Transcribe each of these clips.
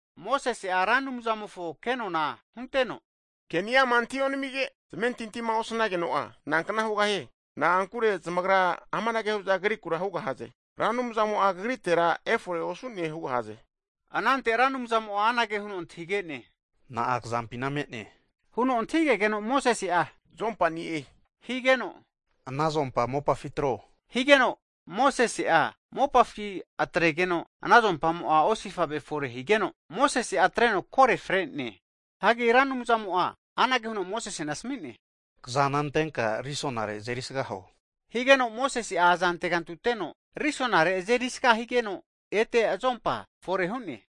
Mosese'a Ra Anumzamofo kenona hunteno, Ke'niama antahi onamige, zamentintima osanageno'a nankna hugahie? Na'ankure zamagra amanage hu'za Kagrikura hugahaze. Ra Anumzamo'a kagritera efore osu'ne hugahaze. Anante Ra Anumzamo'a anage huno antahige'ne, Na'a kazampina me'ne? huno antahigegeno Mosese'a azompani'e higeno, Ana azompa mopafi atro, higeno Mosese'a mopafi atregeno, ana azompamo'a osifave fore higeno, Mosese'a atreno kore fre'ne. Hagi Ra Anumzamo'a anage huno Mosesena asami'ne, Kazana antenka risonare azeri sga huo, higeno Mosese'a aza antegantuteno risonare azeri sga higeno, ete azompa fore hu'ne.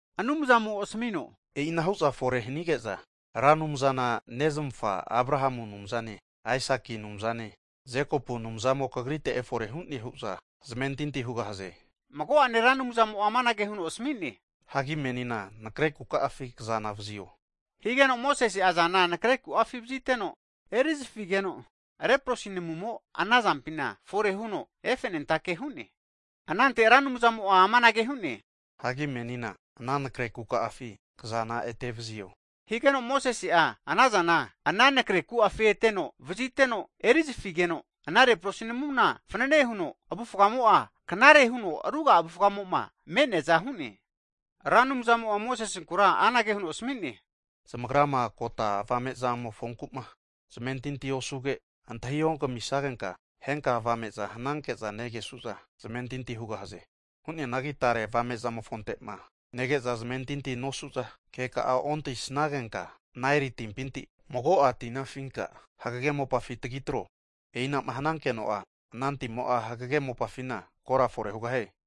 Anumzamo asmino, e'inahu'za fore hanige'za, Ra Anumzana nezmafa Abrahamu Anumzane, Aisaki Anumzane Jekopu Anumzamo kagrite efore hu'ne hu'za zamentinti hugahaze. Mago'ane Ra Anumzamo'a amanage huno asmi'ne, Hagi menina nakre kuka'afi kazana vazio, higeno Mosese'a azana nekre ku'afi vaziteno erizafigeno, leprosi namumo ana azampina fore huno efenentake hu'ne. Anante Ra Anumzamo'a amanage hu'ne, Hagi menina ana nakre kuka'afi kazana ete vazio, higeno Mosese'a ana azana ana nakre ku'afi eteno vaziteno erizafigeno, ana leprosi namuna fanane huno avufgamo'a knare huno ruga'a avufga'mo'ma me'neaza hu'ne. Ra Anumzamo'a Mosesenkura anage huno asami'ne, Zamagrama kota avame'zamofonku'ma zamentinti osuge, antahi ogamisagenka, henka avame'za hnanke'za negesu'za zamentinti hugahaze. Hu'neanagi tare avame'zamofonte'ma nege'za zamentinti nosu'za keka'a ontahisnagenka, Naeli timpinti mago'a tina afinka hagege mopafi tagi tro. E'ina'ma hanankeno'a ana timo'a hagege mopafina kora fore hugahie.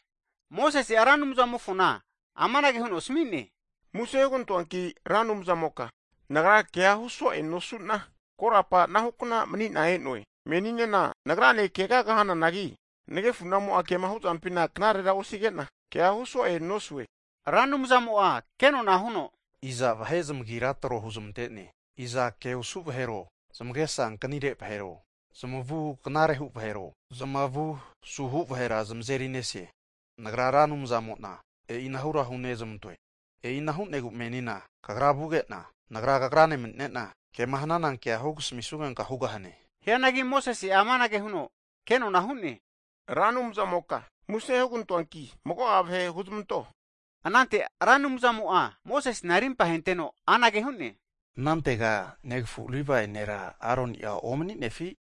Mosese'a Ra Anumzamofona amanage huno asmi'ne, Muse hugantoanki Ra Anumzamoka nagra kea huso'e nosu'na, korapa anahu hu'na mani'na e'noe. Meninena nagrane kegaga hananagi nagefu'namo'a kema huzampina knarera osige'na, kea hu so'e nosue. Ra Anumzamo'a kenona huno, Iza vahe zamagira tro huzmante'ne? Iza ke osu vahero, zamagesa ankanire vahero, zamavu knarehu vahero, zamavu suhu vahera zamazeri nese? Nagra Ra Anumzamo'na e'inara hunezmantoe. E'ina hu'negu menina kagra vuge'na, Nagra kagrane mani'nena, kema hnana kea hugasmisnugenka hugahane. Hianagi Mosese'a amanage huno ke'nona hu'ne, Ra Anumzamoka muse hugantoanki mago'a vahe huzmanto. Anante Ra Anumzamo'a Mosesena rimpahenteno anage hu'ne, Anantega negafu Livae nera Aroni'a omaninefi?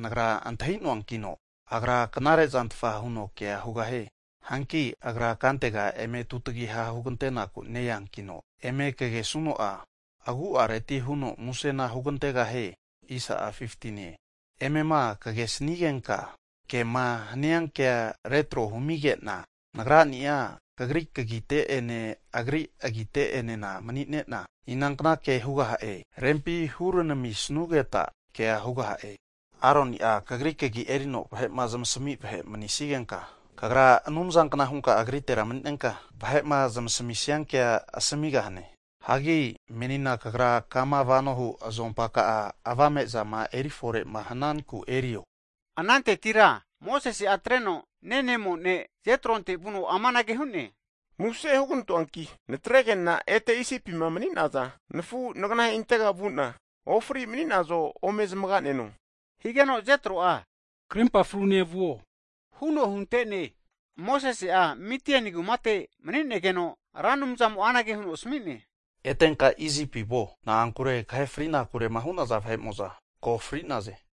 Nagra antahi'noankino agra knare zantfa huno kea hugahie. Hanki agra kantega eme tutagiha hugantenaku ne-eankino, eme kagesuno'a agu'areti huno musena hugantegahie. Emema kagesnigenka, kema hania kea retro humige'na, Nagrani'a kagri kagite'ene agri agite'enena mani'nena inankna kea hugaha'e, rempi huranamisnugeta kea hugaha'e. Aroni'a kagri kagi erino vahe'ma kema zmasami vahe mani'nigenka, kagra Anumzankna hunka agritera mani'nenka vahe'ma zmasamisia kea asamigahane. Hagi menina kagra kama vanohu azompa ka'a, avame'zama erifore'ma hananku erio. Anantetira Mosese'a atreno nenemo ne' Jetronte vuno amanage hu'ne, Muse hugantoanki natrege'na ete Isipima mani'naza nafu nganaheintega vu'na, ofri mani'nazo ome zamaga'neno, higeno Jetro'a krimpa frune vuo huno hunte'ne. Mosese'a Midiani kumate mani'negeno Ra Anumzamo anage huno asmi'ne, Etenka Isipi vuo, na'ankure kahe fri'nakurema hu'naza vahe'mo'za ko' fri'naze.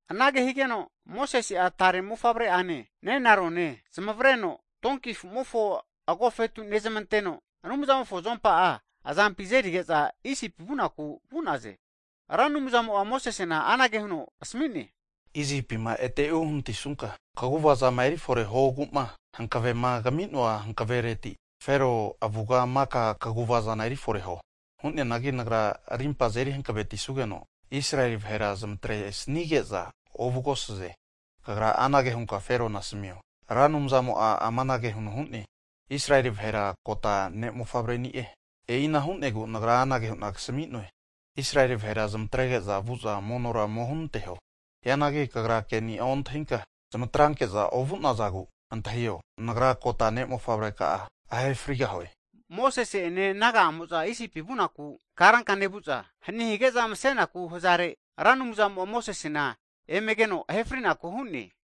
Anage higeno, Mosese'a tare mofavre'ane nenarone zamavreno donki afu'mofo agofetu nezmanteno, Anumzamofo azompa'a azampi azerige'za Isipi vunaku vu'naze. Ra Anumzamo'a Mosesena anage huno asmi'ne, Isipima ete uhanatisunka, kaguvazama erifore huogu'ma hankvema kami'noa hanavereti Fero avuga maka kaguvazana erifore huo. Hu'neanagi Nagra arimpa azeri hankvetisugeno Israeli vahera zmatresnige'za ovugahaze. Kagra anage hunka Ferona asamio, Ra Anumzamo'a amanage huno hu'ne, Israeli vahera kota ne' mofavre'ni'e. E'ina hu'negu Nagra anage hu'na kasami'noe, Israeli vahera zmatrege'za vu'za monora ome hunanteho. Hianagi kagra ke'ni'a ontahinka zmatranke'za ovu'nazagu, antahio, Nagra kota ne' mofavreka'a ahe frigahue! Mosese'ene naga'amo'za Isipi vunaku karanka nevu'za hani hige'za masenaku hazare, Ra Anumzamo'a Mosesena emegeno ahe frinaku hu'ne.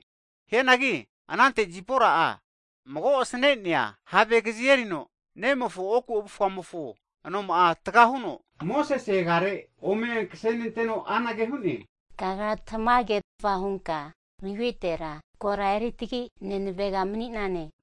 Hianagi anante Zipora'a mago asne'nea have kazi erino, nemofo oku avufamofo anoma'a taga huno, Mosese agiafi ome netreno anage hu'ne, kagra tamagerfa hunka nagritera kora eri tagi nenavega mani'nane hu'ne.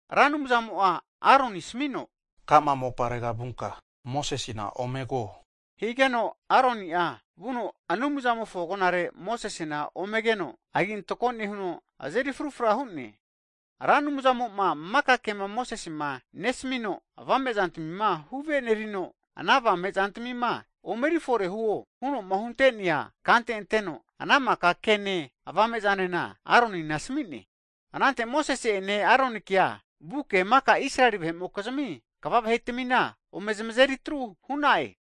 Hagi Ra Anumzamo'a Aronina asmino, Ka'ma moparega vunka Mosesena omego, higeno Aronia vuno Anumzamofo agonare Mosesena omegeno agi antako nehuno, azeri frufra hu'ne. Ra Anumzamo'ma maka kema Mosesema nesamino, avame'zantmima huvenerino, ana avame zantmima omeri fore huo huno'ma hunte'nea kante anteno, ana maka kene avame'zanena Aronina asami'ne. Anante Mosese'ene Aronikea vuke maka Israeli vahe'mokizmi kva vahetmina ome zamazeri atru hu'na'e.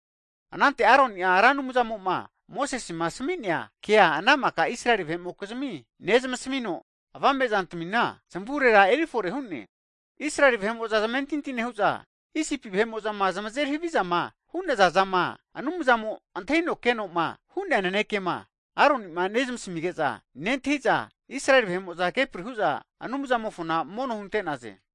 Anante Aroni'a Ra Anumzamo'ma Mosesema asmi'nea kea ana maka Israeli vahe'mokizmi nezmasamino, avame'zantamina zamavurera erifore hu'ne. Israeli vahe'mo'za zamentinti nehu'za, Isipima zamazeri havizama hu'naza zama Anumzamo antahino keno'ma hu'nea nanekema Aroni'ma zamasamige'za nentahi'za, Israeli vahe'mo'za kepri hu'za Anumzamofo mono hunte'naze.